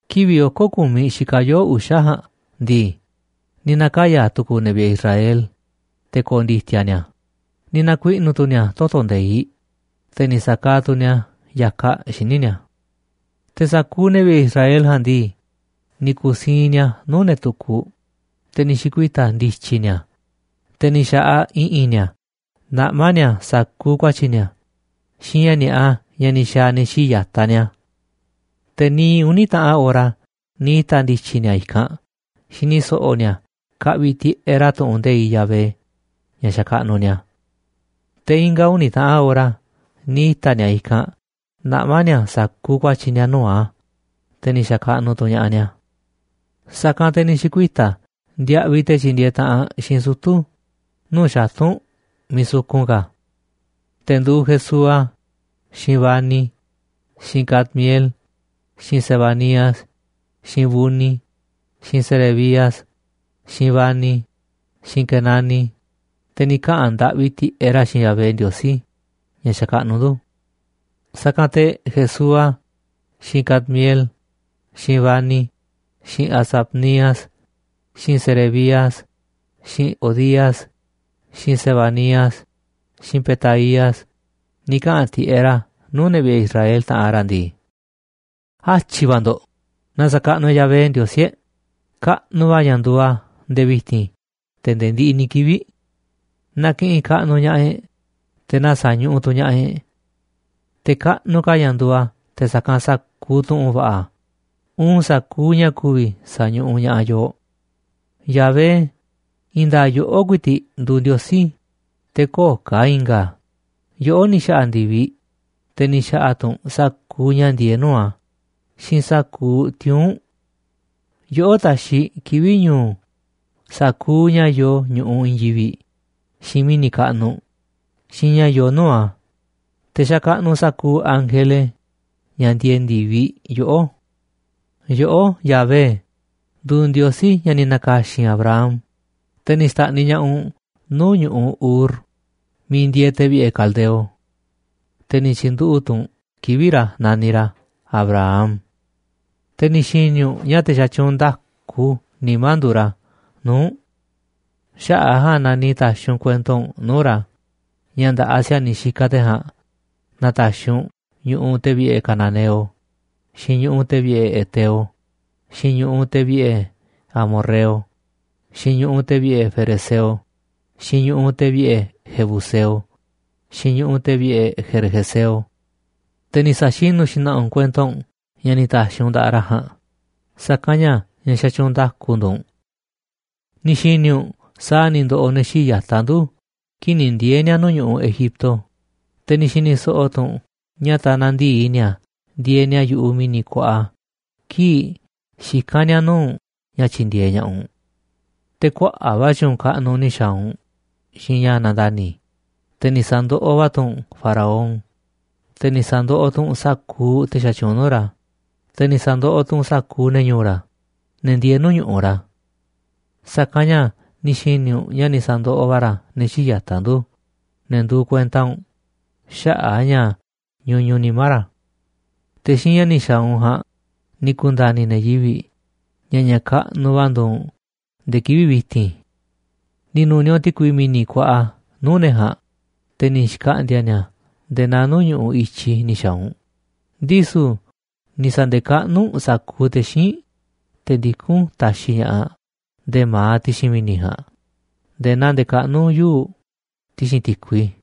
Kivi̱ꞌ oko̱ ku̱miꞌ xikaꞌ yoo̱ꞌ uxa̱ ja̱a̱nꞌ ndii, ni̱ na̱kaya̱ tu̱ku̱u̱ ne̱ vi̱ꞌe̱ Israel te̱ ko̱o̱ ndi̱ti̱a̱ ni̱a̱, ni̱ na̱kuiꞌnu̱ tu̱ ni̱a̱ toto̱ nde̱iꞌ, te̱ ni̱ sa̱kaaꞌ tu̱ ni̱a̱ ya̱kaꞌ xíniꞌ ni̱a̱. Te̱ sa̱kuuꞌ ne̱ vi̱ꞌe̱ Israel ja̱a̱nꞌ ndii, ni̱ ku̱siinꞌ ni̱a̱ nuu̱ꞌ ne̱ tukuꞌ, te̱ ni̱ xi̱kuita̱ ndi̱tyi̱ ni̱a̱, te̱ ni̱ xa̱ꞌaꞌ i̱ꞌi̱n ni̱a̱ naꞌmá ni̱a̱ sa̱kuuꞌ ku̱a̱tyi̱ ni̱a̱, xiinꞌ ña̱ ni̱a̱ꞌa ña̱ ni̱ xa̱a̱ ne̱ xíiꞌ ya̱taꞌ ni̱a̱. Te̱ niiꞌ uni̱ taꞌan ora ni̱ ita̱ ndi̱tyi̱ ni̱a̱ i̱kanꞌ xini so̱ꞌo̱ ni̱a̱ kaꞌviꞌ tiꞌeꞌ ra̱ tu̱ꞌu̱n nde̱iꞌ Yahvé, ña̱ xakaꞌnuꞌ ni̱a̱. Te̱ i̱nga̱ uni̱ taꞌan ora ni̱ ita̱ ni̱a̱ i̱kanꞌ naꞌmá ni̱a̱ sa̱kuuꞌ ku̱a̱tyi̱ ni̱a̱ nuu̱ꞌ a̱, te̱ ni̱ xa̱kaꞌnuꞌ tu̱ ña̱ꞌaꞌ ni̱a̱. Sa̱kanꞌ te̱ ni̱ xi̱kuita̱ ndiaꞌviꞌ te̱ tyindieeꞌ taꞌanꞌ xiinꞌ sutu̱ nuu̱ꞌ xatu̱nꞌ miiꞌ sukun ka̱, te̱ nduuꞌ Jesúa, xiinꞌ Bani, xiinꞌ Cadmiel, xiinꞌ Sebanías, xiinꞌ Buni, xiinꞌ Serebías, xiinꞌ Bani, xiinꞌ Quenani, te̱ ni̱ kaꞌa̱n ndaꞌvi tiꞌeꞌ ra̱ xiinꞌ Yahvé Ndiosí ña̱ xakaꞌnuꞌ ndu̱. Sa̱kanꞌ te̱ Jesúa, xiinꞌ Cadmiel, xiinꞌ Bani, xiinꞌ Hasabnías, xiinꞌ Serebías, xiinꞌ Hodías, xiinꞌ Sebanías, xiinꞌ Petaías, ni̱ kaꞌa̱n tiꞌeꞌ ra̱ nuu̱ꞌ ne̱ vi̱ꞌe̱ Israel, taꞌanꞌ ra̱ ndii: ―Atyi̱ va̱ ndo̱ꞌ, na sa̱kaꞌnuꞌ e̱ꞌ Yahvé Ndiosí e̱ꞌ. Kaꞌnuꞌ va̱ ña̱ nduuꞌ a̱ nde̱e̱ vi̱ti̱n te̱ nde̱e̱ ndiꞌiꞌ ni̱ kivi̱ꞌ. Na ki̱ꞌi̱n kaꞌnuꞌ ña̱ꞌaꞌ e̱ꞌ, te̱ na sa̱ñuꞌuꞌ tu̱ ña̱ꞌaꞌ e̱ꞌ. Te̱ kaꞌnuꞌ ka̱ ña̱ nduuꞌ a̱ te̱ sa̱kanꞌ sa̱kuuꞌ tu̱ꞌu̱nꞌ va̱ꞌa, uun sa̱kuuꞌ ña̱ ku̱vi̱ sa̱ñuꞌuꞌ ña̱ꞌaꞌ yooꞌ. Yahvé, i̱i̱n nda̱a̱ꞌ yoꞌó ku̱i̱ti̱ꞌ nduuꞌ Ndiosí, te̱ köo̱ꞌ ka̱ i̱nga̱ a̱. Yoꞌó ni̱ xa̱ꞌa̱ ndi̱viꞌ, te̱ ni̱ xa̱ꞌa̱ tu̱ u̱nꞌ sa̱kuuꞌ ña̱ ndieeꞌ nuu̱ꞌ a̱, xiinꞌ sa̱kuuꞌ tiuu̱nꞌ. Yoꞌó taxiꞌ kivi̱ꞌ ñu̱u̱ sa̱kuuꞌ ña̱ yoo ñu̱ꞌuꞌ i̱i̱n yivi̱ꞌ, xiinꞌ mi̱ni̱ kaꞌnuꞌ, xiinꞌ ña̱ yoo nuu̱ꞌ a̱, te̱ xakaꞌnuꞌ sa̱kuuꞌ ángele, ña̱ ndieeꞌ ndi̱viꞌ, yoꞌó. ’Yoꞌó, Yahvé, nduuꞌ Ndiosí ña̱ ni̱ na̱ka̱xi̱n Abram, te̱ ni̱ xta̱ꞌniꞌ ña̱ꞌaꞌ u̱nꞌ nuu̱ꞌ ñu̱ꞌuꞌ Ur miiꞌ ndieeꞌ te̱ vi̱ꞌe̱ caldeo, te̱ ni̱ tyi̱nduꞌu̱ꞌ tu̱ u̱nꞌ kivi̱ꞌ ra̱ naniꞌ ra̱ Abraham. Te̱ ni̱ xi̱ni̱ u̱nꞌ ña̱ te̱ xatyuunꞌ nda̱ku nimá nduuꞌ ra̱ nuu̱ꞌ u̱nꞌ. Xaꞌa̱ꞌ a̱ ja̱a̱nꞌ na ni̱ ta̱xi̱ u̱nꞌ kuento u̱nꞌ nuu̱ꞌ ra̱ ña̱ nda̱ꞌaꞌ si̱a̱niꞌ xikaꞌ te̱ ja̱a̱nꞌ na̱ta̱xi̱ u̱nꞌ ñu̱ꞌuꞌ te̱ vi̱ꞌe̱ cananeo, xiinꞌ ñu̱ꞌuꞌ te̱ vi̱ꞌe̱ heteo, xiinꞌ ñu̱ꞌuꞌ te̱ vi̱ꞌe̱ amorreo, xiinꞌ ñu̱ꞌuꞌ te̱ vi̱ꞌe̱ ferezeo, xiinꞌ ñu̱ꞌuꞌ te̱ vi̱ꞌe̱ jebuseo, xiinꞌ ñu̱ꞌuꞌ te̱ vi̱ꞌe̱ gergeseo. Te̱ ni̱ sa̱xinu̱ xna̱ꞌa̱ u̱nꞌ kuento u̱nꞌ ña̱ ni̱ ta̱xi̱ u̱nꞌ nda̱ꞌaꞌ ra̱ ja̱a̱nꞌ, sa̱kanꞌ ña̱ ña̱ xatyuunꞌ nda̱ku nduuꞌ u̱nꞌ. ’Ni̱ xi̱ni̱ u̱nꞌ sa̱a̱ ni̱ ndo̱ꞌo̱ ne̱ xíiꞌ ya̱taꞌ ndu̱ kii̱ꞌ ni̱ ndiee̱ ni̱a̱ nuu̱ꞌ ñu̱ꞌuꞌ Egipto, te̱ ni̱ xi̱ni̱ so̱ꞌo̱ tu̱ u̱nꞌ ña̱ tanaꞌ ndi̱i ni̱a̱ ndieeꞌ ni̱a̱ yu̱ꞌuꞌ mi̱ni̱ kuaꞌa kii̱ꞌ xikán ni̱a̱ nuu̱ꞌ u̱nꞌ ña̱ tyi̱ndi̱e̱eꞌ ña̱ꞌaꞌ u̱nꞌ. Te̱ kuaꞌa̱ꞌ va̱ tyu̱u̱n kaꞌnuꞌ ni̱ xa̱a̱ u̱nꞌ xiinꞌ ña̱ nandani̱, te̱ ni̱ sa̱ndoꞌoꞌ va̱ tu̱ u̱nꞌ Faraón, te̱ ni̱ sa̱ndoꞌoꞌ tu̱ u̱nꞌ sa̱kuuꞌ te̱ xatyuunꞌ nuu̱ꞌ ra̱, te̱ ni̱ sa̱ndoꞌoꞌ tu̱ u̱nꞌ sa̱kuuꞌ ne̱ ñu̱u̱ ra̱, ne̱ ndieeꞌ nuu̱ꞌ ñu̱ꞌuꞌ ra̱. Sa̱kanꞌ ña̱ ni̱ xi̱ni̱ u̱nꞌ ña̱ ni̱ sa̱ndoꞌoꞌ va̱ ra̱ ne̱ xíiꞌ ya̱taꞌ ndu̱, ne̱ nduuꞌ kuenta u̱nꞌ, xaꞌa̱ꞌ a̱ ña̱ ñuñuꞌ nimá ra̱. Te̱ xiinꞌ ña̱ ni̱ xa̱a̱ u̱nꞌ ja̱a̱nꞌ ni̱ ku̱nda̱ni̱ ne̱ yivi̱ꞌ ña̱ ña̱ kaꞌnuꞌ va̱ nduuꞌ u̱nꞌ nde̱e̱ kivi̱ꞌ vi̱ti̱n. Ni̱ nu̱niaꞌ u̱nꞌ ti̱kui mi̱ni̱ kuaꞌa nuu̱ꞌ ne̱ ja̱a̱nꞌ, te̱ ni̱ xkaꞌndi̱a̱ ni̱a̱ nde̱e̱ naa nuu̱ꞌ ñu̱ꞌuꞌ i̱tyi ni̱ xa̱a̱ u̱nꞌ, ndisu̱ ni̱ sa̱nde̱kaꞌnúꞌ u̱nꞌ sa̱kuuꞌ te̱ xíinꞌ, te̱ ndikún taxiꞌ ña̱ꞌaꞌ nde̱ma̱aꞌ ti̱xi̱n mi̱ni̱ ja̱a̱nꞌ nde̱e̱ naa ndekaꞌnú yuu̱ꞌ ti̱xi̱n ti̱kui.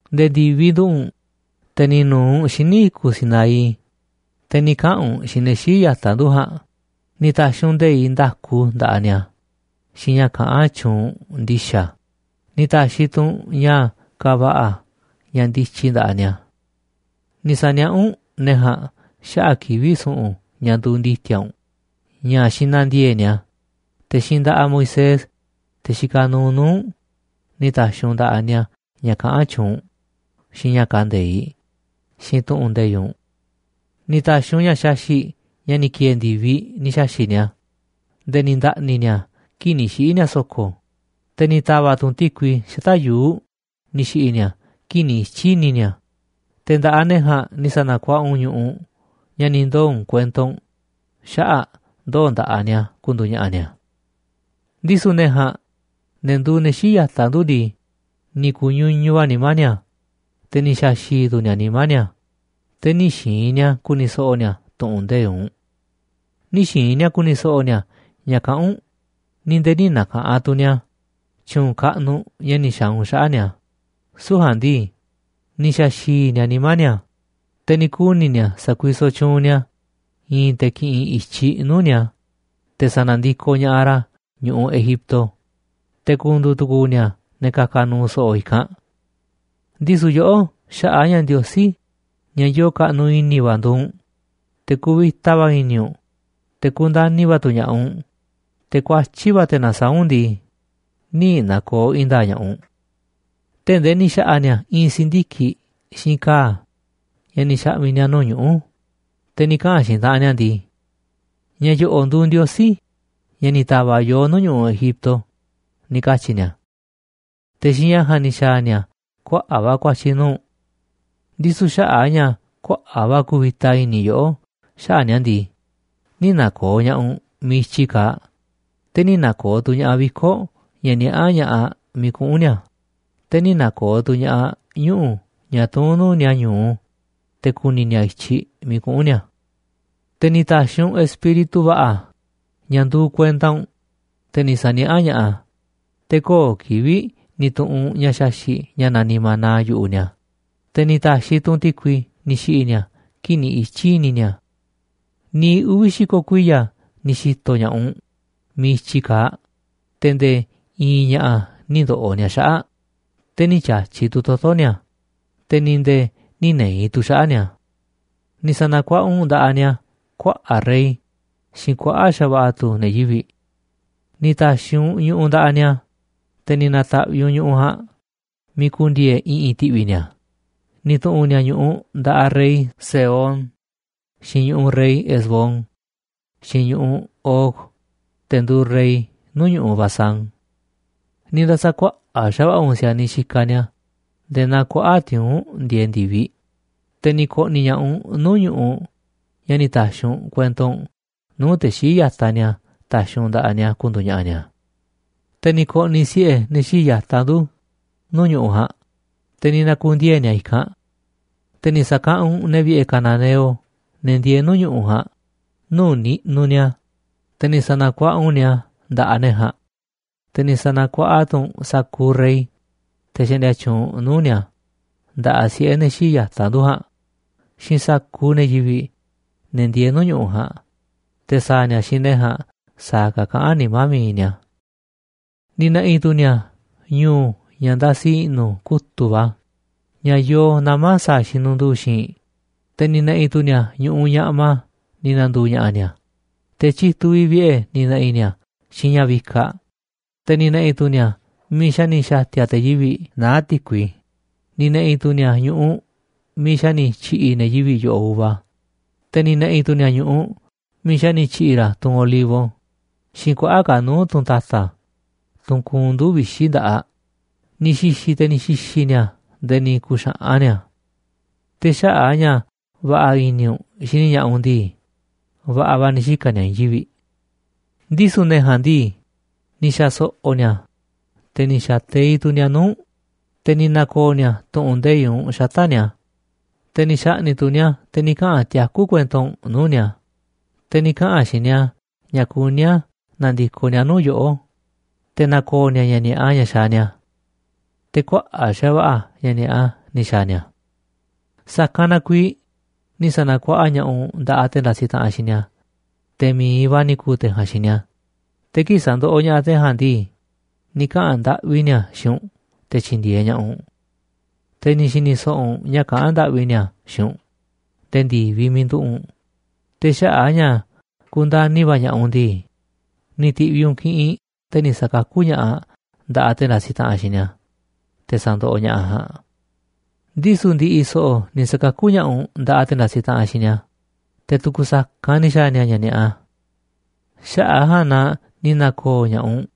’Nde̱e̱ ndi̱viꞌ nduꞌu̱ꞌ u̱nꞌ, te̱ ni̱ nu̱u̱ u̱nꞌ xíniꞌ i̱kuꞌ Sinaí, te̱ ni̱ kaꞌa̱n u̱nꞌ xiinꞌ ne̱ xíiꞌ ya̱taꞌ ndu̱ ja̱a̱nꞌ, ni̱ ta̱xi̱ u̱nꞌ nde̱iꞌ nda̱ku nda̱ꞌaꞌ ni̱a̱, xiinꞌ ña̱ kaꞌán tyuunꞌ ndi̱xa̱, ni̱ ta̱xi̱ tu̱ u̱nꞌ ña̱ kava̱ꞌa̱ ña̱ ndityi nda̱ꞌaꞌ ni̱a̱. Ni̱ sa̱niaꞌá u̱nꞌ ne̱ ja̱a̱nꞌ xaꞌa̱ꞌ kivi̱ꞌ su̱ꞌu̱n ña̱ nduuꞌ ndi̱ti̱a̱ u̱nꞌ ña̱ xinandiee̱ꞌ ni̱a̱. Te̱ xiinꞌ nda̱ꞌaꞌ Moisés, te̱ xikaꞌ nuuꞌ nuu̱ꞌ u̱nꞌ, ni̱ ta̱xi̱ u̱nꞌ nda̱ꞌaꞌ ni̱a̱ ña̱ kaꞌán tyuunꞌ u̱nꞌ, xiinꞌ ña̱ kande̱iꞌ, xiinꞌ tu̱ꞌu̱n nde̱iꞌ u̱nꞌ. Ni̱ ta̱xi̱ u̱nꞌ ña̱ xaxi̱ꞌ, ña̱ ni̱ ki̱e̱e̱ ndi̱viꞌ, ni̱ xa̱xi̱ꞌ ni̱a̱ nde̱e̱ ni̱ nda̱ꞌni̱ ni̱a̱ kii̱ꞌ ni̱ xiꞌi̱ ni̱a̱ so̱ko̱. Te̱ ni̱ ta̱va̱ꞌ tu̱ u̱nꞌ ti̱kui xata̱ꞌ yuu̱ꞌ ni̱ xi̱ꞌi̱ ni̱a̱ kii̱ꞌ ni̱ ityi̱ i̱ni̱ ni̱a̱. Te̱ nda̱ꞌaꞌ ne̱ ja̱a̱nꞌ ni̱ sa̱na̱kuaꞌa u̱nꞌ ñu̱ꞌuꞌ ña̱ ni̱ ndoo̱ u̱nꞌ kuento u̱nꞌ xaꞌa̱ꞌ ndoo̱ nda̱ꞌaꞌ ni̱a̱ ku̱ndu̱u̱ ña̱ꞌa̱ ni̱a̱. ’Ndisu̱ ne̱ ja̱a̱nꞌ, ne̱ nduu ne̱ xíiꞌ ya̱taꞌ ndu̱ ndii, ni̱ ku̱ñuñuꞌ va̱ nimá ni̱a̱, te̱ ni̱ xa̱xi̱i̱ tu̱ ni̱a̱ nimá ni̱a̱, te̱ nï̱ xi̱i̱n ni̱a̱ ku̱ni̱ so̱ꞌo̱ ni̱a̱ tu̱ꞌu̱n nde̱iꞌ u̱nꞌ. Nï̱ xi̱i̱n ni̱a̱ ku̱ni̱ so̱ꞌo̱ ni̱a̱ ña̱ kaꞌán u̱nꞌ, ni̱ nde̱e̱ nï̱ na̱ka̱ꞌanꞌ tu̱ ni̱a̱ tyu̱u̱n kaꞌnuꞌ ña̱ ni̱ xa̱a̱ u̱nꞌ xaꞌa̱ꞌ ni̱a̱, süu̱ꞌ ja̱a̱nꞌ ndii, ni̱ xa̱a̱ xi̱i̱ ni̱a̱ nimá ni̱a̱, te̱ ni̱ kuni̱ ni̱a̱ sa̱kuisoꞌ tyuunꞌ ni̱a̱ i̱i̱n te̱ ki̱ꞌi̱n i̱tyiꞌ nuu̱ꞌ ni̱a̱ te̱ sa̱na̱ndikoꞌ ña̱ꞌaꞌ ra̱ ñu̱ꞌuꞌ Egipto, te̱ ku̱ndu̱u̱ tu̱ku̱u̱ ni̱a̱ ne̱ ka̱ka̱ nu̱u̱ so̱ꞌo̱ i̱kanꞌ. Ndisu̱ yoꞌó, xaꞌa̱ꞌ a̱ ña̱ Ndiosí ña̱ yoo kaꞌnuꞌ i̱ni̱ va̱ nduuꞌ u̱nꞌ, te̱ kuvita va̱ i̱ni̱ u̱nꞌ, te̱ kundani̱ va̱ tu̱ ña̱ꞌaꞌ u̱nꞌ, te̱ kuatyí va̱ te̱ nasaáꞌ u̱nꞌ ndii, nï̱ na̱ko̱o̱ i̱i̱n nda̱a̱ꞌ ña̱ꞌaꞌ u̱nꞌ, tee̱ꞌ ndee ni̱ xa̱ꞌa̱ ni̱a̱ i̱i̱n si̱ndiki̱ꞌ xiinꞌ ka̱a̱ ña̱ ni̱ xa̱ꞌmi̱ ni̱a̱ nuu̱ꞌ ñuꞌu̱, te̱ ni̱ kaꞌa̱n xiinꞌ taꞌanꞌ ni̱a̱ ndii: “Ña̱ yo̱ꞌo̱ꞌ nduuꞌ ndiosí, ña̱ ni̱ ta̱va̱ꞌ yooꞌ nuu̱ꞌ ñu̱ꞌuꞌ Egipto,” ni̱ katyi̱ ni̱a̱. Te̱ xiinꞌ ña̱ ja̱a̱nꞌ ni̱ xa̱a̱ ni̱a̱ kuaꞌa̱ꞌ va̱ ku̱a̱tyi̱ nuu̱ꞌ u̱nꞌ. ’Ndisu̱ xaꞌa̱ꞌ a̱ ña̱ kuaꞌa̱ꞌ va̱ kuvita i̱ni̱ yoꞌó xaꞌa̱ꞌ ni̱a̱ ndii, nï̱ na̱ko̱o̱ ña̱ꞌaꞌ u̱nꞌ miiꞌ i̱tyi kaaꞌ, te̱ nï̱ na̱ko̱o̱ tu̱ ña̱ꞌaꞌ viko̱ꞌ ña̱ niaꞌá ña̱ꞌaꞌ miiꞌ kuꞌu̱n ni̱a̱, te̱ nï̱ na̱ko̱o̱ tu̱ ña̱ꞌaꞌ ñuꞌu̱ ña̱ tuún nuu̱ꞌ ni̱a̱ ñu̱u te̱ ku̱ni̱ ni̱a̱ i̱tyiꞌ miiꞌ kuꞌu̱n ni̱a̱. Te̱ ni̱ ta̱xi̱ u̱nꞌ Espíritu va̱ꞌa̱ ña̱ nduuꞌ kuenta u̱nꞌ, te̱ ni̱ sa̱niaꞌá ña̱ꞌaꞌ a̱, te̱ köo̱ꞌ kivi̱ꞌ ni̱ tu̱ꞌu̱n u̱nꞌ ña̱ xaxi̱ꞌ ña̱ naniꞌ maná yu̱ꞌuꞌ ni̱a̱, te̱ ni̱ ta̱xi̱ tu̱ u̱nꞌ ti̱kui ni̱ xi̱ꞌi̱ ni̱a̱ kii̱ꞌ ni̱ ityi̱ i̱ni̱ ni̱a̱. Niiꞌ uvi̱ xi̱ko̱ kuiya̱ ni̱ xi̱to̱ ña̱ꞌaꞌ u̱nꞌ miiꞌ i̱tyi kaaꞌ, te̱ nde̱e̱ i̱i̱n ña̱ꞌa̱ nï̱ ndo̱ꞌo̱ ni̱a̱ xaꞌa̱ꞌ, te̱ nï̱ ti̱a̱tyi̱ tu̱ toto̱ ni̱a̱, te̱ ni̱ nde̱e̱ nï̱ ne̱i̱ tu̱ xaꞌa̱ꞌ ni̱a̱. ’Ni̱ sa̱na̱kuaꞌa u̱nꞌ nda̱ꞌaꞌ ni̱a̱ kuaꞌa̱ꞌ rey xiinꞌ kuaꞌa̱ꞌ xa̱va̱ꞌa̱ tu̱ ne̱ yivi̱ꞌ. Ni̱ ta̱xi̱ u̱nꞌ ñu̱ꞌuꞌ nda̱ꞌaꞌ ni̱a̱, te̱ ni̱ na̱ta̱ꞌviꞌ u̱nꞌ ñu̱ꞌuꞌ ja̱a̱nꞌ miiꞌ ku̱ndi̱e̱e̱ i̱ꞌi̱n ti̱ꞌvi̱ ni̱a̱, ni̱ tu̱ꞌu̱n ni̱a̱ ñu̱ꞌuꞌ nda̱ꞌaꞌ rey Sehón, xiinꞌ ñu̱ꞌuꞌ rey Hesbón, xiinꞌ ñu̱ꞌuꞌ Og, te̱ nduuꞌ rey nuu̱ꞌ ñu̱ꞌuꞌ Basán. Ni̱ nda̱sa̱kuaꞌa̱ꞌ xa̱va̱ꞌa̱ u̱nꞌ si̱a̱niꞌ xikaꞌ ni̱a̱ nde̱e̱ naa kuaꞌa̱ꞌ tiuu̱nꞌ ndieeꞌ ndi̱viꞌ, te̱ ni̱ ko̱ꞌni̱ ña̱ꞌaꞌ u̱nꞌ nuu̱ꞌ ñu̱ꞌuꞌ ña̱ ni̱ ta̱xi̱ u̱nꞌ kuento u̱nꞌ nuu̱ꞌ te̱ xíiꞌ ya̱taꞌ ni̱a̱ ta̱xi̱ u̱nꞌ nda̱ꞌaꞌ ni̱a̱ ku̱ndu̱u̱ ña̱ꞌa̱ ni̱a̱. Te̱ ni̱ ko̱ꞌni̱ siꞌe̱ ne̱ xii̱ꞌ yata̱ ndu̱ nuu̱ꞌ ñu̱ꞌuꞌ ja̱a̱nꞌ, te̱ ni̱ na̱ku̱ndiee̱ ni̱a̱ i̱kanꞌ. Te̱ ni̱ sa̱kaꞌanꞌ u̱nꞌ ne̱ vi̱ꞌe̱ cananeo, ne̱ ndieeꞌ nuu̱ꞌ ñu̱ꞌuꞌ ja̱a̱nꞌ, nuu̱ꞌ niꞌnuꞌ ni̱a̱, te̱ ni̱ sa̱na̱kuaꞌa u̱nꞌ ni̱a̱ nda̱ꞌaꞌ ne̱ ja̱a̱nꞌ, te̱ ni̱ sa̱na̱kuaꞌa tu̱ u̱nꞌ sa̱kuuꞌ rey, te̱ xaꞌndia tyuunꞌ nuu̱ꞌ ni̱a̱, nda̱ꞌaꞌ siꞌe̱ ne̱ xii̱ꞌ ya̱taꞌ ndu̱ ja̱a̱nꞌ xiinꞌ sa̱kuuꞌ ne̱ yivi̱ꞌ, ne̱ ndieeꞌ nuu̱ꞌ ñu̱ꞌuꞌ ja̱a̱nꞌ, te̱ sa̱a̱ ni̱a̱ xiinꞌ ne̱ ja̱a̱nꞌ sa̱a̱ ka̱ kaꞌán nimá mi̱iꞌ ni̱a̱. Ni̱ na̱ꞌi̱ tu̱ ni̱a̱ ñu̱u ña̱ ndasi i̱ꞌnu̱ kutu̱ꞌ va̱ ña̱ yoo nama̱ sa̱a̱ xinunduu xi̱i̱nꞌ, te̱ ni̱ na̱ꞌi̱ tu̱ ni̱a̱ ñu̱ꞌuꞌ ñaꞌma ni̱ na̱ndu̱u̱ ña̱ꞌa̱ ni̱a̱, te̱ tyituꞌ vi̱ꞌ vi̱ꞌe̱ ni̱ na̱ꞌi̱ ni̱a̱ xiinꞌ ña̱ vikaꞌ, te̱ ni̱ na̱ꞌi̱ tu̱ ni̱a̱ miiꞌ xa̱ ni̱ xa̱ti̱a̱ te̱ yivi̱ꞌ naá ti̱kui, ni̱ na̱ꞌi̱ tu̱ ni̱a̱ ñu̱ꞌuꞌ miiꞌ xa̱ ni̱ tyi̱ꞌi̱ ne̱ yivi̱ꞌ yo̱ꞌoꞌ uva, te̱ ni̱ na̱ꞌi̱ tu̱ ni̱a̱ ñu̱ꞌuꞌ miiꞌ xa̱ ni̱ tyi̱ꞌi̱ ra̱ tunꞌ olivo xiinꞌ kuaꞌa̱ꞌ ka̱ nuu̱ꞌ tunꞌ ta̱ta̱, tunꞌ kuunꞌ nduu̱ꞌ vixi̱ nda̱ꞌaꞌ, ni̱ xi̱xi̱ te̱ ni̱ xi̱xi̱ ni̱a̱ nde̱e̱ ni̱ ku̱xa̱ꞌan ni̱a̱. Te̱ xaꞌa̱ꞌ a̱ ña̱ va̱ꞌa̱ i̱ni̱ u̱nꞌ xini ña̱ꞌaꞌ u̱nꞌ ndii, va̱ꞌa̱ va̱ ni̱ xika̱ ni̱a̱ i̱i̱n yivi̱ꞌ. ’Ndisu̱ ne̱ ja̱a̱nꞌ ndii, ni̱ xa̱ so̱ꞌo̱ ni̱a̱, te̱ ni̱ xa̱ teiꞌ tu̱ ni̱a̱ nuu̱ꞌ u̱nꞌ, te̱ ni̱ na̱ko̱o̱ ni̱a̱ tu̱ꞌu̱n nde̱iꞌ u̱nꞌ xata̱ꞌ ni̱a̱, te̱ ni̱ xa̱ꞌni̱ꞌ tu̱ ni̱a̱ te̱ ni̱ kaꞌa̱n tiakú kuento u̱nꞌ nuu̱ꞌ ni̱a̱, te̱ ni̱ kaꞌa̱n xiinꞌ ni̱a̱ ña̱ kuní a̱ na̱ndi̱koꞌ ni̱a̱ nuu̱ꞌ yoꞌó, te̱ na̱ko̱o̱ ni̱a̱ ña̱ ni̱a̱ꞌa ña̱ xaaꞌ ni̱a̱. Te̱ kuaꞌa̱ꞌ xa̱va̱ꞌa̱ va̱ ña̱ ni̱a̱ꞌa ni̱ xa̱a̱ ni̱a̱. Sa̱kanꞌ na kuiiꞌ ni̱ sa̱na̱kuaꞌa ña̱ꞌaꞌ u̱nꞌ nda̱ꞌaꞌ te̱ ndasiꞌ taꞌanꞌ xiinꞌ ni̱a̱, te̱ mi̱iꞌ va̱ ni̱ ku̱u̱ te̱ ja̱a̱nꞌ xiinꞌ ni̱a̱, te̱ kii̱ꞌ sa̱ndoꞌoꞌ ña̱ꞌaꞌ te̱ ja̱a̱nꞌ ndii, ni̱ kaꞌa̱n ndaꞌvi ni̱a̱ xiinꞌ u̱nꞌ te̱ tyi̱ndi̱e̱eꞌ ña̱ꞌaꞌ u̱nꞌ. Te̱ ni̱ xi̱ni̱ so̱ꞌo̱ u̱nꞌ ña̱ kaꞌán ndaꞌvi ni̱a̱ xiinꞌ u̱nꞌ nde̱e̱ ndi̱viꞌ miiꞌ nduꞌu̱ꞌ u̱nꞌ, te̱ xaꞌa̱ꞌ a̱ ña̱ kundani̱ va̱ ña̱ꞌaꞌ u̱nꞌ ndii, ni̱ ti̱ꞌviꞌ u̱nꞌ kiꞌinꞌ te̱ ni̱ sa̱kakú ña̱ꞌaꞌ nda̱ꞌaꞌ te̱ ndasiꞌ taꞌanꞌ xiinꞌ ni̱a̱, te̱ sandoꞌoꞌ ña̱ꞌaꞌ ja̱a̱nꞌ. ’Ndisu̱ ndi̱ꞌi̱ so̱ꞌo̱ ni̱ sa̱kakú ña̱ꞌaꞌ u̱nꞌ nda̱ꞌaꞌ te̱ ndasiꞌ taꞌanꞌ xiinꞌ ni̱a̱, te̱ tu̱ku̱ sa̱kanꞌ ni̱ xa̱a̱ ni̱a̱ ña̱ ni̱a̱ꞌa. Xaꞌa̱ꞌ a̱ ja̱a̱nꞌ na ni̱ na̱ko̱o̱ ña̱ꞌaꞌ u̱nꞌ,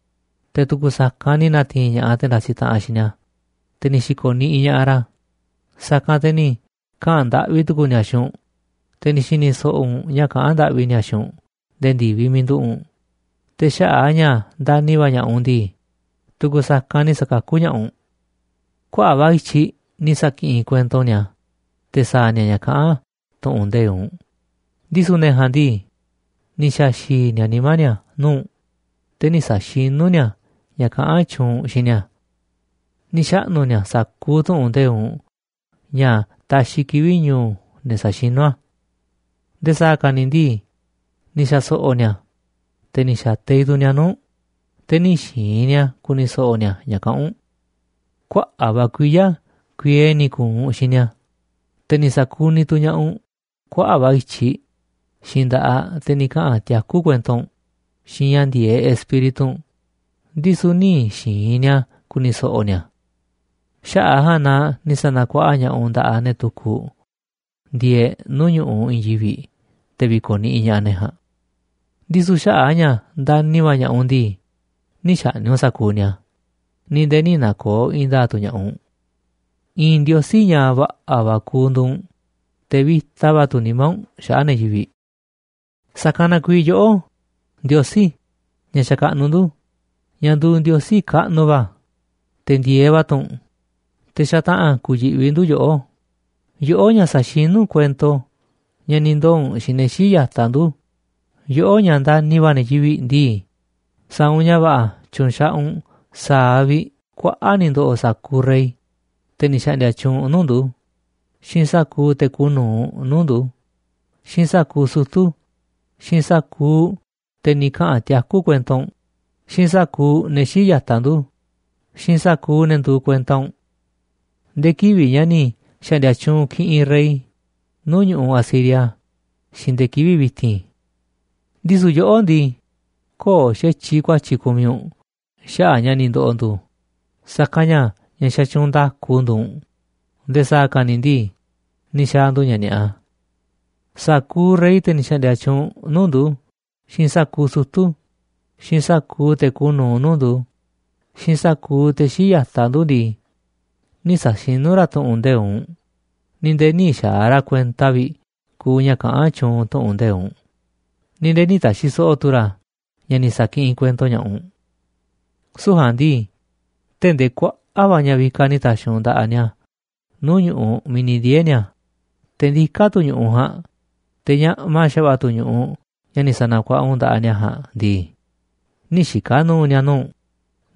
te̱ tu̱ku̱ sa̱kanꞌ ni̱ na̱ti̱i̱n ña̱ꞌaꞌ te̱ ndasi taꞌanꞌ xiinꞌ ni̱a̱, te̱ ni̱ xi̱ko̱ niꞌiꞌ ña̱ꞌaꞌ ra̱, sa̱kanꞌ te̱ ni̱ kaꞌa̱n ndaꞌvi tu̱ku̱u̱ ni̱a̱ xiinꞌ u̱nꞌ, te̱ ni̱ xi̱ni̱ so̱ꞌo̱ u̱nꞌ ña̱ kaꞌán ndaꞌvi ni̱a̱ xiinꞌ u̱nꞌ nde̱e̱ ndi̱viꞌ miiꞌ nduꞌu̱ꞌ u̱nꞌ, te̱ xaꞌa̱ꞌ a̱ ña̱ ndani̱ va̱ ña̱ꞌaꞌ u̱nꞌ ndii, tu̱ku̱ sa̱kanꞌ ni̱ sa̱kakú ña̱ꞌaꞌ u̱nꞌ. ’Kuaꞌa̱ꞌ va̱ i̱tyiꞌ ni̱ sa̱kiꞌinꞌ kuento u̱nꞌ ni̱a̱ te̱ sa̱a̱ ni̱a̱ ña̱ kaꞌán tu̱ꞌu̱n nde̱iꞌ u̱nꞌ, ndisu̱ ne̱ ja̱a̱nꞌ ndii, ni̱ xa̱xi̱i̱ ni̱a̱ nimá ni̱a̱ nuu̱ꞌ u̱nꞌ, te̱ nï̱ sa̱xinú ni̱a̱ ña̱ kaꞌán tyuunꞌ u̱nꞌ xiinꞌ ni̱a̱. Ni̱ xaꞌnu̱ ni̱a̱ sa̱kuuꞌ tu̱ꞌu̱n nde̱iꞌ u̱nꞌ ña̱ taxiꞌ kivi̱ꞌ ñu̱u̱ ne̱ saxinu̱ a̱. Nde̱e̱ sa̱a̱ ka̱ ni̱ ndii, ni̱ xa̱so̱ꞌo̱ ni̱a̱, te̱ ni̱ xa̱teiꞌ tu̱ ni̱a̱ nuu̱ꞌ u̱nꞌ, te̱ nï̱ xi̱i̱n ni̱a̱ ku̱ni̱ so̱ꞌo̱ ni̱a̱ ña̱ kaꞌán u̱nꞌ. Kuaꞌa̱ꞌ va̱ kuiya̱ kuiee ni̱ ku̱u̱ u̱nꞌ xiinꞌ ni̱a̱, te̱ ni̱ sa̱kuniꞌ tu̱ ña̱ꞌaꞌ u̱nꞌ kuaꞌa̱ꞌ va̱ i̱tyiꞌ xiinꞌ nda̱ꞌaꞌ, te̱ ni̱ kaꞌa̱n tiakú kuento u̱nꞌ xiinꞌ ña̱ ndi̱e̱eꞌ Espíritu u̱nꞌ, ndisu̱ nï̱ xi̱i̱n ni̱a̱ ku̱ni̱ so̱ꞌo̱ ni̱a̱. Xaꞌa̱ꞌ a̱ ja̱a̱nꞌ na ni̱ sa̱na̱kuaꞌa ña̱ꞌaꞌ u̱nꞌ nda̱ꞌaꞌ ne̱ tukuꞌ ndieeꞌ nuu̱ꞌ ñu̱ꞌuꞌ i̱i̱n yivi̱ꞌ te̱ vi̱ko̱niꞌiꞌ ña̱ꞌaꞌ ne̱ ja̱a̱nꞌ. Ndisu̱ xaꞌa̱ꞌ a̱ ña̱ ndani̱ va̱ ña̱ꞌaꞌ u̱nꞌ ndii, nï̱ xa̱ꞌni̱ꞌ u̱nꞌ sa̱kuuꞌ ni̱a̱, ni̱ nde̱e̱ nï̱ na̱ko̱o̱ i̱i̱n nda̱a̱ꞌ tu̱ ña̱ꞌaꞌ u̱nꞌ. I̱i̱n Ndiosí ña̱ va̱ꞌa̱ va̱ kuuꞌ nduuꞌ u̱nꞌ, te̱ vi̱ta va̱ tu̱ nimá u̱nꞌ xaꞌa̱ꞌ ne̱ yivi̱ꞌ. ’Sa̱kanꞌ na kuiiꞌ yoꞌó, Ndiosí, ña̱ xakaꞌnuꞌ ndu̱, ña̱ nduuꞌ Ndiosí kaꞌnuꞌ va̱, te̱ ndi̱e̱eꞌ va̱ tu̱ u̱nꞌ, te̱ xataꞌa̱n ku̱yi̱ꞌvi ndu̱ yoꞌó, yoꞌó ña̱ saxinu̱ kuento ña̱ ni̱ ndoo̱ u̱nꞌ xiinꞌ ne̱ xíiꞌ ya̱taꞌ ndu̱, yoꞌó ña̱ ndani̱ va̱ ne̱ yivi̱ꞌ ndii, sa̱a̱ u̱nꞌ ña̱ va̱ꞌa̱ tyu̱nxaꞌaꞌ u̱nꞌ sa̱a̱ vi̱ꞌ kuaꞌa̱ꞌ ni̱ ndo̱ꞌo̱ sa̱kuuꞌ rey, te̱ ni̱ xa̱ꞌndi̱a̱ tyuunꞌ nuu̱ꞌ ndu̱, xiinꞌ sa̱kuuꞌ te̱ kuuꞌ nu̱uꞌ nuu̱ꞌ ndu̱, xiinꞌ sa̱kuuꞌ sutu̱, xiinꞌ sa̱kuuꞌ te̱ ni̱ kaꞌa̱n tiakú kuento u̱nꞌ, xiinꞌ sa̱kuuꞌ ne̱ xíiꞌ ya̱taꞌ ndu̱, xiinꞌ sa̱kuuꞌ ne̱ nduuꞌ kuenta u̱nꞌ. Nde̱e̱ kivi̱ꞌ ña̱ ni̱ xa̱ꞌndi̱a̱ tyuunꞌ kiꞌinꞌ rey nuu̱ꞌ ñu̱ꞌuꞌ Asiria, xiinꞌ nde̱e̱ kivi̱ꞌ vi̱ti̱n. Ndisu̱ yoꞌó ndii, köo̱ꞌ xa̱tyiꞌ ku̱a̱tyi̱ kumiꞌ u̱nꞌ xaꞌa̱ꞌ ña̱ ni̱ ndo̱ꞌo̱ ndu̱, sa̱kanꞌ ña̱ ña̱ xatyuunꞌ nda̱ku nduuꞌ u̱nꞌ, nde̱e̱ sa̱a̱ ka̱ ni̱ ndii, ni̱ xa̱a̱ ndu̱ ña̱ ni̱a̱ꞌa. Sa̱kuuꞌ rey, te̱ ni̱ xa̱ꞌndi̱a̱ tyuunꞌ nuu̱ꞌ ndu̱, xiinꞌ sa̱kuuꞌ sutu̱, xiinꞌ sa̱kuuꞌ te̱ kuuꞌ nu̱uꞌ nuu̱ꞌ ndu̱, xiinꞌ sa̱kuuꞌ te̱ xíiꞌ ya̱taꞌ ndu̱ ndii, nï̱ sa̱xinú ra̱ tu̱ꞌu̱n nde̱iꞌ u̱nꞌ, ni̱ nde̱e̱ nï̱ xa̱a̱ ra̱ kuenta vi̱ꞌ kuuꞌ ña̱ kaꞌán tyuunꞌ tu̱ꞌu̱n nde̱iꞌ u̱nꞌ, ni̱ nde̱e̱ nï̱ ta̱xi̱ so̱ꞌo̱ tu̱ ra̱ ña̱ ni̱ sa̱kiꞌinꞌ kuento ña̱ꞌaꞌ u̱nꞌ. Süu̱ꞌ ja̱a̱nꞌ ndii, tee̱ꞌ ndee kuaꞌa̱ꞌ va̱ ña̱ vikaꞌ ni̱ ta̱xi̱ u̱nꞌ nda̱ꞌaꞌ ni̱a̱ nuu̱ꞌ ñu̱ꞌuꞌ miiꞌ ni̱ ndiee̱ ni̱a̱, te̱ ndiká tu̱ ñu̱ꞌuꞌ ja̱a̱nꞌ, te̱ ñaꞌma xa̱va̱ꞌa̱ tu̱ ñu̱ꞌuꞌ ña̱ ni̱ sa̱na̱kuaꞌa u̱nꞌ nda̱ꞌaꞌ ni̱a̱ ja̱a̱nꞌ ndii, nï̱ xika̱ nu̱u̱ ni̱a̱ nuu̱ꞌ u̱nꞌ,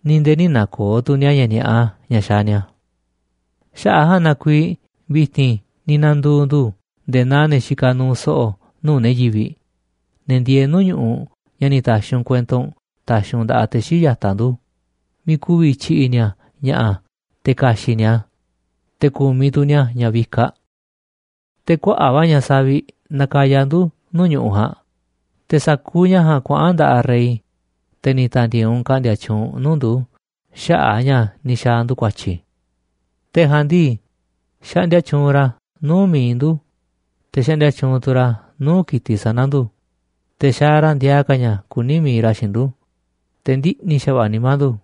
ni̱ nde̱e̱ nï̱ na̱ko̱o̱ tu̱ ni̱a̱ ña̱ ni̱a̱ꞌa ña̱ xaaꞌ ni̱a̱. ’Xaꞌa̱ꞌ a̱ ja̱a̱nꞌ na kuiiꞌ vi̱ti̱n ni̱ na̱ndu̱u̱ ndu̱ nde̱e̱ naa ne̱ xikaꞌ nuuꞌ so̱ꞌo̱ nuu̱ꞌ ne̱ yivi̱ꞌ, ne̱ ndieeꞌ nuu̱ꞌ ñu̱ꞌuꞌ ña̱ ni̱ ta̱xi̱ u̱nꞌ kuento u̱nꞌ ta̱xi̱ u̱nꞌ nda̱ꞌaꞌ te̱ xíiꞌ ya̱taꞌ ndu̱, miiꞌ ku̱vi̱ tyi̱ꞌi̱ ni̱a̱ ña̱ꞌa̱ te̱ ka̱xi̱ꞌ ni̱a̱ a̱, te̱ ku̱miꞌ tu̱ ni̱a̱ ña̱ vikaꞌ. Te̱ kuaꞌa̱ꞌ va̱ ña̱ saviꞌ nakaya ndu̱ nuu̱ꞌ ñu̱ꞌuꞌ ja̱a̱nꞌ, te̱ sa̱kuuꞌ ña̱ ja̱a̱nꞌ kuaꞌa̱n nda̱ꞌaꞌ rey, te̱ ni̱ ta̱ndi̱e̱e̱ u̱nꞌ ka̱ꞌndi̱a̱ tyuunꞌ nuu̱ꞌ ndu̱ xaꞌa̱ꞌ a̱ ña̱ ni̱ xa̱a̱ ndu̱ ku̱a̱tyi̱. Te̱ ja̱a̱nꞌ ndii, xaꞌndia tyuunꞌ ra̱ nuu̱ꞌ mi̱iꞌ ndu̱, te̱ xaꞌndia tyuunꞌ tu̱ ra̱ nuu̱ꞌ ki̱tiꞌ sana̱ ndu̱, te̱ xaaꞌ ra̱ ndiaa ka̱ ña̱ kuni̱ mi̱iꞌ ra̱ xiinꞌ ndu̱, te̱ ndiꞌni̱ xa̱va̱ꞌa̱ nimá ndu̱.